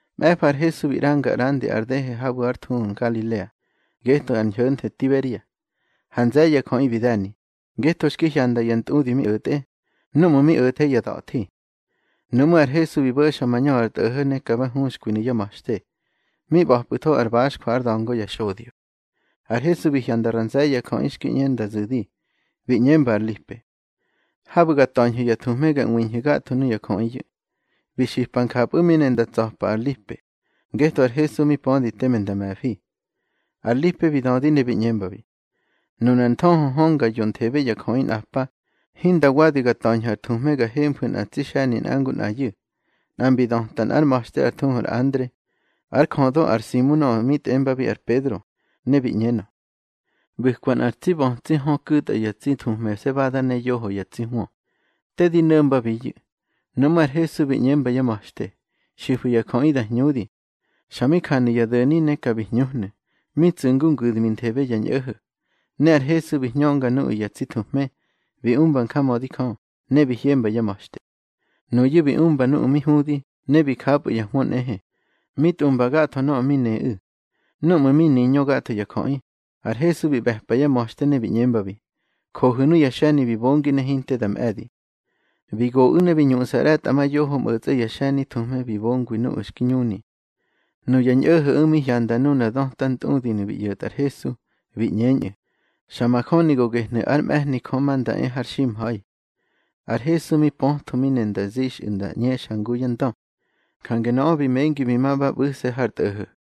Mꞌe̱fa ar Hesu bi ꞌranga ꞌrandi ar dehe habu̱ ár thuhu Ngalilea, getꞌö ar ñho̱nthe Tiberia. Ha nze̱ye̱ ya jöꞌi bi de̱ni, ngetho xki hyanda ya ntꞌudi mi o̱tꞌe, núꞌmu̱ mi o̱the ya da̱thi. Nuꞌmú̱ ar Hesu bi bo̱xa mañö ar tꞌo̱ho̱ ne ka ba huxkwinu̱ yá ma̱xte. Mi ꞌba̱pꞌu̱tho ar baxjwa ár da̱ngo ya xodyo. Ar Hesu mi hyanda ra nze̱ye̱ ya jöꞌi xki ꞌñe nda zu̱di, bi ꞌñemba ar Lipe: —Habu̱ ga ta̱ñhu̱ ya thuhme ga ꞌwiñhu̱ gatho nuya jöꞌiyu̱. Bi xipa njapꞌu̱ mi ne nda tsa̱ta ar Lipe, ngetho ar Hesu mi pödi teme nda me̱fi. Ar Lipe bi dödi ne bi ꞌñembabi: —Nunar nthöhö hönga yonthebe ya jöꞌi nꞌa pa, hinda wadi ga ta̱ñhu̱ ar thuhme ga hemfu̱ nꞌa tsi xe̱ni nꞌa ngu nꞌayu̱. Nꞌa mbi döta nꞌár ma̱xte ár thuhu ar Andre, ár jödö ar Simu nöꞌö mi tꞌembabi ar Pedro, ne bi ꞌñenö: —ꞌBu̱kwa nꞌar bötsi hö ku̱tꞌa ya tsi thuhmesebada ne yoho ya tsi hwö. Te di no̱mbabiyu̱. Nuꞌmú̱ ar Hesu bi ꞌñemba yá ma̱xte: —Xifu̱ ya jöꞌi da hñudi. Xa mi janu̱ ya do̱ni ne ka bi hñuhnu̱, mi tsu̱ ngu ngu̱dminthebe ya ñꞌo̱ho̱. Ne ar Hesu bi hñönga nuꞌu̱ ya tsi thuhme, bi umba njamödi Jö, ne bi hyemba yá ma̱xte. Nuyu̱ bi umba nuꞌu̱ mi hudi, ne bi japꞌu̱ ya hwö nꞌehe, mi tꞌumba gatho nöꞌö mi neꞌu̱. Núꞌmu̱ mi niñö gatho ya jöꞌi, ar Hesu bi ꞌbe̱pa yá ma̱xte, ne bi ꞌñembabi: —Johu̱ nuya xe̱ni bi bongi ne hinte da mꞌe̱di. Bi goꞌu̱ ne bi ñuꞌsa ꞌre̱tꞌamayoho mꞌo̱tsꞌe ya xe̱ni thuhme bi bongwabi nuꞌu̱ xki ñuni. Nuya ñꞌo̱ho̱ꞌu̱ mi hyanda nuna döta ntꞌudinu̱ bi ꞌyo̱tꞌa ar Hesu, bi ꞌñeñꞌu̱: —Xa majöni go gehnu̱ ár mꞌe̱hni Jö ma nda e har ximha̱i. Ar Hesu mi pötho mi ne nda zixꞌu̱ nda ꞌñexa ngu yá ndö. Jange nöꞌö bi mengi bi ma ba ꞌbu̱se̱ har tꞌo̱ho̱.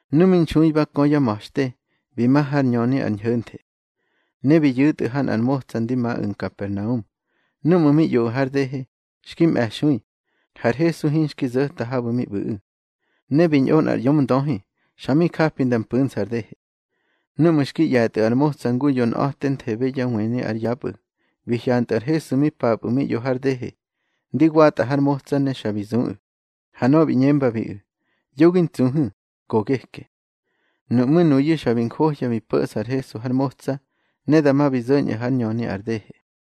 Nu mi nxui ba kö yá ma̱xte, bi ma hár ñöni ar ñho̱nthe. Ne bi yu̱tꞌu̱ ha nꞌar motsa ndi maꞌu̱ Nkapernaum. Núꞌmu̱ mi ꞌyoꞌu̱ har dehe, xki mꞌe̱xui, har Hesu hinxki zo̱ta habu̱ mi ꞌbu̱ꞌu̱. Ne bi ñꞌo nꞌar ꞌyomndöhi, xa mi japi nda mpu̱nsa ar dehe. Núꞌmu̱ xki ꞌye̱tꞌu̱ ar motsa ngu yonꞌa̱tenthebe ya wëni ár yapꞌu̱, bi hyantꞌu̱ ar Hesu mi papꞌu̱ mi ꞌyo har dehe, ndi watꞌa har motsa, ne xa bi zuꞌu̱. Ha nöꞌö bi ꞌñembabiꞌu̱: —Yo gi ntsuhu̱, go geke. Nuꞌmú̱ nuyu̱ xa bi njohya bi po̱ꞌsa ar Hesu har motsa, ne dama bi zo̱ñꞌu̱ hár ñöni ar dehe.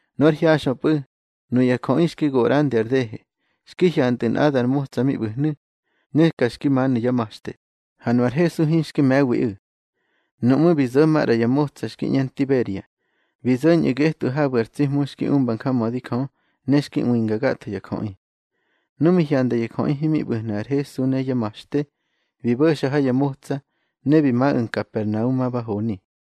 Nu ár hyaxꞌöpꞌu̱, nuya jöꞌi xki go ꞌrandi ar dehe, xki hyantꞌu̱ nꞌadar motsa mi ꞌbu̱hnu̱, ne ka xki manu̱ yá ma̱xte, ha nu ar Hesu hinxki me̱wiꞌu̱. Nuꞌmú̱ bi zo̱ maꞌra ya motsa xki ꞌñe Tiberia, bi zo̱ñꞌu̱ getꞌu̱ habu̱ ar tsi Hmu xki umba njamödi Jö, ne xki ꞌwinga gatho ya jöꞌi. Nu mi hyanda ya jöꞌi himi ꞌbu̱hnu̱ ar Hesu ne yá ma̱xte, bi bo̱xa ha ya motsa, ne bi maꞌu̱ Nkapernaum ma ba honi.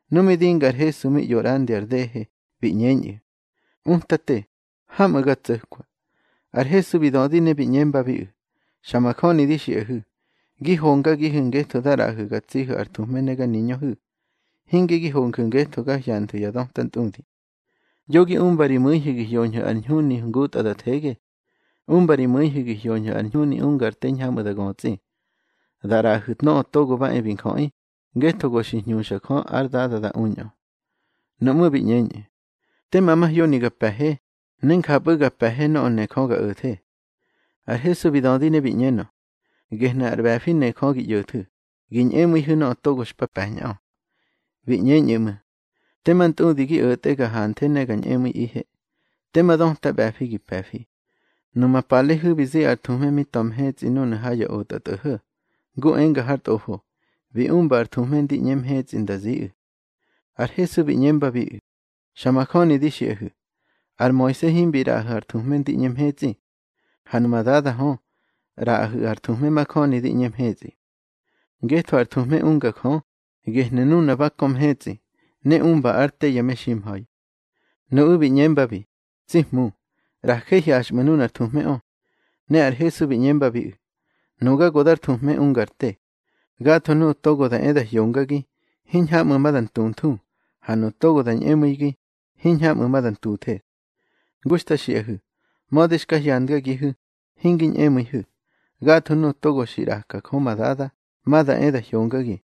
Nu mi dinga ar Hesu mi ꞌyo ꞌrandi ar dehe, bi ꞌñeñꞌu̱: —Utate, hamꞌu̱ ga tso̱kwa. Ar Hesu bi dödi ne bi ꞌñembabiꞌu̱: —Xa majöni di xiꞌahu̱, gi hongagihu̱ ngetho da ꞌraꞌahu̱ ga tsihu̱ ar thuhme ne ga niñöhu̱, hinge gi honju̱ ngetho ga hyanthu̱ ya döta ntꞌudi. Yo gi umba ri mu̱ihu̱ gi hoñhu̱ ar ñhuni ngutꞌa da thege. Umba ri mu̱ihu̱ gi hyoñhu̱ ar ñhuni unga ar te hiñhamꞌu̱ da götsꞌi, da ꞌraꞌahu̱ Nöꞌö Togo ba e bi Njöꞌi, ngetho go xi hñuxa Jö ár Dada da uñꞌö. Nuꞌmú̱ bi ꞌñeñꞌu̱: —Tema mahyoni ga pe̱he, ne njapꞌu̱ ga pe̱he nöꞌö ne Jö ga o̱the. Ar Hesu bi dödi ne bi ꞌñenö: —Gehnu̱ ar ꞌbe̱fi ne Jö gi ꞌyo̱thu̱, gi ñꞌemu̱ihu̱ nöꞌö togo xpa pe̱ñꞌö. Bi ꞌñeñꞌu̱ ꞌmu̱: —Tema ntꞌudi gi o̱tꞌe ga hanthe ne ga ñꞌemu̱iꞌihe. Tema döta ꞌbe̱fi gi pe̱fi. Numa palehu̱ bi zi ar thuhme mi ta̱ mahetsꞌi núnu̱ ha ya otꞌatꞌo̱ho̱, ngu enga har tꞌofo: Bi umba ar thuhme ndi ꞌñe mhetsꞌi nda ziꞌu̱. Ar Hesu bi ꞌñembabiꞌu̱: —Xa majöni di xiꞌahu̱, ar Moise himbi ꞌraꞌahu̱ ar thuhme ndi ꞌñe mhetsꞌi. Ha numa Dada hö, ꞌraꞌahu̱ ar thuhme majöni di ꞌñe mhetsꞌi. Ngetho ar thuhme unga Jö, gehnu̱ nuna ba kö mhetsꞌi, ne umba ár te ya meximha̱i. Nuꞌu̱ bi ꞌñembabi: —Tsi Hmu, ꞌraje hyaxꞌmu̱ nunar thuhmeꞌö. Ne ar Hesu bi ꞌñembabiꞌu̱: —Nuga go dar thuhme ungar te. Gatho nuꞌu̱ togo da e da hyongagi, hiñhamꞌu̱ ma da ntunthu, ha nuꞌu̱ togo da ñꞌemu̱igi, hiñhamꞌu̱ ma da ntuthe. Ngu xta xiꞌahu̱, mödi xka hyandgagihu̱, hingi ñꞌemu̱ihu̱. Gatho nuꞌu̱ togo xi ꞌraka Jö ma Dada, ma da e da hyongagi.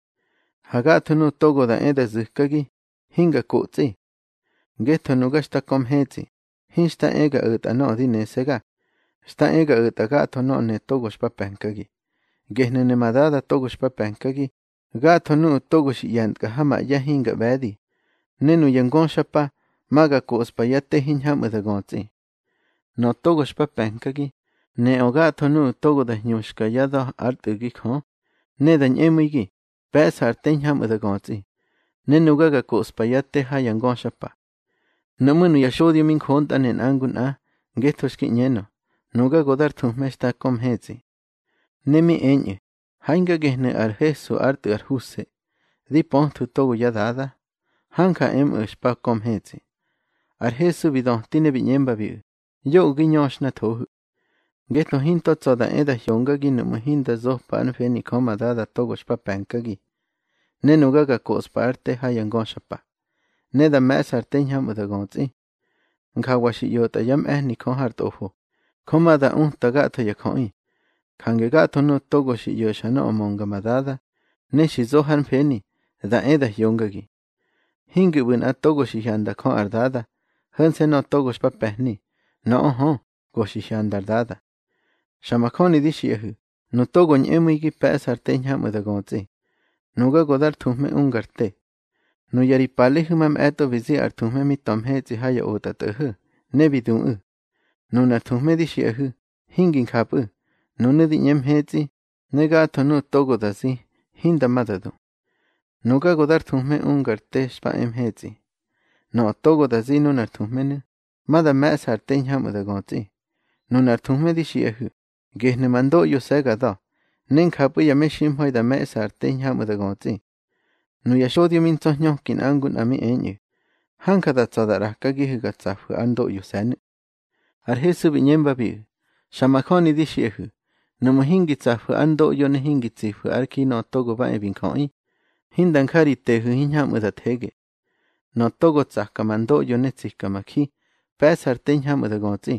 Ha gatho nuꞌu̱ togo da e da zu̱kagi, hinga kotsꞌi. Ngetho nuga xta kö mhetsꞌi, hinxta ehe ga o̱tꞌa nöꞌö di nese̱ga, xta e ga o̱tꞌa gatho nöꞌö ne togo xpa pe̱nkagi. Gehnu̱ ne ma Dada togo xpa pe̱nkagi, gatho nuꞌu̱ togo xi ꞌye̱ntkꞌa ha ma ꞌye̱ hinga ꞌbe̱di, ne nuya ngöxapa, ma ga koꞌspa yá te hiñhamꞌu̱ da götsꞌi. Nöꞌö togo xpa pe̱nkagi, neꞌö gatho nuꞌu̱ togo da hñuxka yá da̱ ár Tꞌu̱gi Jö, ne da ñꞌemu̱igi, pe̱ꞌsa ar te hiñhamꞌu̱ da götsꞌi, ne nuga ga koꞌspa yá te ha ya ngöxapa. Nuꞌmú̱ nuya xodyo mi njontꞌane nꞌa ngu nꞌa, ngetho xki ꞌñeñꞌö: Nuga go dar thuhme xta kö mhetsꞌi. Ne mi eñꞌu̱: —Ha hinga gehnu̱ ar Hesu ár tꞌu̱ ar Huse, di pöthwu̱ togo yá dada. Hanja emꞌu̱ xpa kö mhetsꞌi. Ar Hesu bi döti ne bi ꞌñembabiꞌu̱: —Yoꞌö gi ñöxhnathohu̱. Ngetho hinto tsa̱ da e da hyongagi nuꞌmu̱ hinda zopa ár mfeni Jö ma Dada togo xpa pe̱nkagi. Ne nuga ga koꞌspa ár te ha ya ngöxapa, ne da me̱ꞌsa ar te hiñhamꞌu̱ da götsꞌi. Njawa xi ꞌyotꞌa yá mꞌe̱hni Jö har tꞌofo: Jö ma da uta gatho ya jöꞌi. Jange gatho nuꞌu̱ togo xi ꞌyo̱xa nöꞌö mönga ma Dada, ne xi zo hár mfeni, da e da hyongagi. Hingi ꞌbu̱ nꞌa togo xi hyanda Jö ar Dada, ho̱nse̱ nöꞌö togo xpa pe̱hni. Nöꞌö hö, go xi hyanda ar Dada. Xa majöni di xiꞌahu̱, nu togo ñꞌemu̱igi pe̱ꞌsa ar te hiñhamꞌu̱ da götsꞌi. Nuga go dar thuhme ungar te. Nuya ri palehu̱ mamꞌe̱tꞌo bi zi ar thuhme mi ta̱ mhetsꞌi ha ya otꞌatꞌo̱ho̱, ne bi duꞌu̱. Nunar thuhme di xiꞌahu̱, hingi njapꞌu̱. Nunu̱ di ꞌñe mhetsꞌi, ne gatho nuꞌu̱ togo da zi, hinda ma da du. Nuga go dar thuhme ungar te xpa e mhetsꞌi. Nöꞌö togo da zi nuna thuhmenu̱, ma da me̱ꞌsa ar te hiñhamꞌu̱ da götsꞌi. Nunar thuhme di xiꞌahu̱, gehnu̱ ma ndoꞌyose̱ ga da̱, ne njapꞌu̱ ya meximha̱i da me̱ꞌsa ar te hiñhamꞌu̱ da götsꞌi. Nuya xodyo mi ntsa̱hñöki nꞌa ngu nꞌa mi eñꞌu̱: —Hanja da tsa̱ da ꞌrakagihu̱ ga tsafu̱ ár ndoꞌyose̱nu̱. Ar Hesu bi ꞌñembabiꞌu̱: —Xa majöni di xiꞌahu̱, nuꞌmu̱ hingi tsafu̱ ár ndoꞌyo ne hingi tsifu̱ ár ji Nöꞌö Togo ba e bi Njöꞌi, hinda nja ri tehu̱ hiñhamꞌu̱ thege. Nöꞌö togo tsaka ma ndoꞌyo ne tsika ma ji, pe̱ꞌsa ar te hiñhamꞌu̱ da götsꞌi,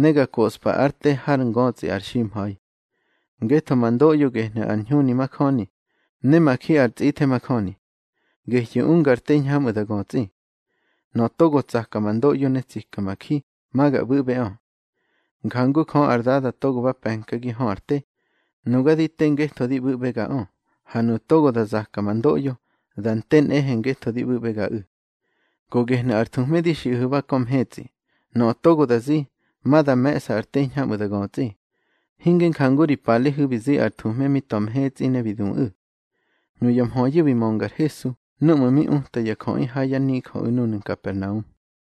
ne ga koꞌspa ár te hár ngötsꞌi ar ximha̱i. Ngetho ma ndoꞌyo gehnu̱ ar ñhuni majöni, ne ma ji ar tsꞌithe majöni. Gehyu̱ unga ar te hiñhamꞌu̱ da götsꞌi. Nöꞌö togo tsaka ma ndoꞌyo ne tsika ma ji, ma ga ꞌbu̱ꞌbeꞌö. Njangu Jö ar Dada togo ba pe̱nkagi hö ar te, nuga di te ngetho di ꞌbu̱ꞌbegaꞌö. Ha nuꞌu̱ togo da zaka ma ndoꞌyo, da nte nꞌehe ngetho di ꞌbu̱ꞌbegaꞌu̱. Go gehnu̱ ar thuhme di xiꞌahu̱ ba kö mhetsꞌi. Nöꞌö togo da zi, ma da me̱ꞌsa ar te hiñhamꞌu̱ da götsꞌi, hinge njangu ri palehu̱ bi zi ar thuhme mi ta̱ mhetsꞌi, ne bi duꞌu̱. Nuya mhöyu̱ bi mönga ar Hesu núꞌmu̱ mi uta ya jöꞌi ha yá nijöꞌu̱ núnu̱ Nkapernaum.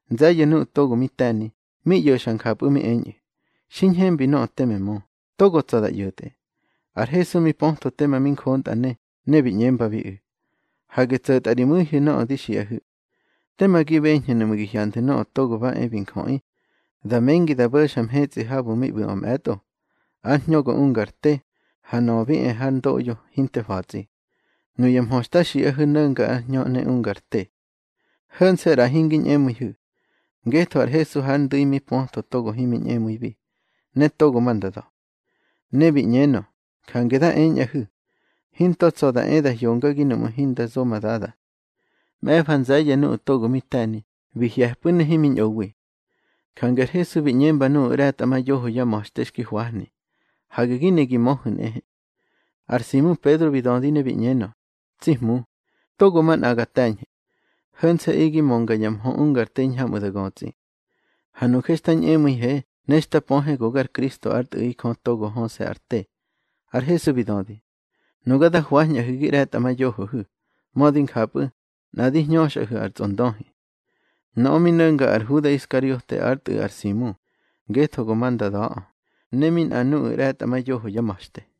Nze̱ye̱ nuꞌu̱ togo mi te̱ni, mi ꞌyo̱xa njapꞌu̱ mi eñꞌu̱: —Xi ñhembi nöꞌö teme mö. Togo tsa̱ da ꞌyo̱tꞌe. Ar Hesu mi pötho tema mi njontꞌane, ne bi ꞌñembabiꞌu̱: —Hage tso̱tꞌa ri mu̱ihu̱ nöꞌö di xiꞌahu̱. Tema gi beñhu̱ nuꞌmu̱ gi hyanthu̱ Nöꞌö Togo ba e bi Njöꞌi, da mengi da bo̱xa mhetsꞌi habu̱ mi ꞌbu̱ꞌö mꞌe̱tꞌo. Ar hñö go unga ar te, ha nöꞌö bi e har ndoꞌyo hinte fa̱tsꞌi. Nuya mhö xta xiꞌahu̱ no̱nga ar hñö ne unga ar te. Ho̱nse̱, ꞌra hingi ñꞌemu̱ihu̱. Ngetho ar Hesu hár ndu̱i mi pötho togo himi ñꞌemu̱ibi, ne togo ma nda da̱. Ne bi ꞌñenö: —Jange da eñꞌahu̱, hinto tsa̱ da e da hyongagi nuꞌmu̱ hinda zo ma Dada. Mꞌe̱fa nze̱ye̱ nuꞌu̱ togo mi te̱ni, bi hye̱pꞌu̱ ne himi ñꞌowi. Jange ar Hesu bi ꞌñemba nuꞌu̱ ꞌre̱tꞌamayoho yá ma̱xte xki hwahni: —Hage gi ne gi möhu̱ nꞌehe. Ar Simu Pedro bi dödi ne bi ꞌñenö: —Tsi Hmu, togo manꞌa ga te̱ñhe. Ho̱nse̱ꞌi gi mönga ya mhö ungar te hiñhamꞌu̱ da götsꞌi. Ha nuje xta ñꞌemu̱ihe ne xta pöhe go gar Kristo ár Tꞌu̱ꞌi Jö togo höse̱ ar te. Ar Hesu bi dödi: —Nuga da hwañꞌahu̱ gi ꞌre̱tꞌamayohohu̱. Mödi njapꞌu̱, nꞌa di hñöxꞌahu̱ ar tsꞌondöhi. Nöꞌö mi no̱nga ar Huda Iskariote ár tꞌu̱ ar Simu, ngetho go ma nda da̱ꞌö, ne mi nꞌa nuꞌu̱ ꞌre̱tꞌamayoho yá ma̱xte.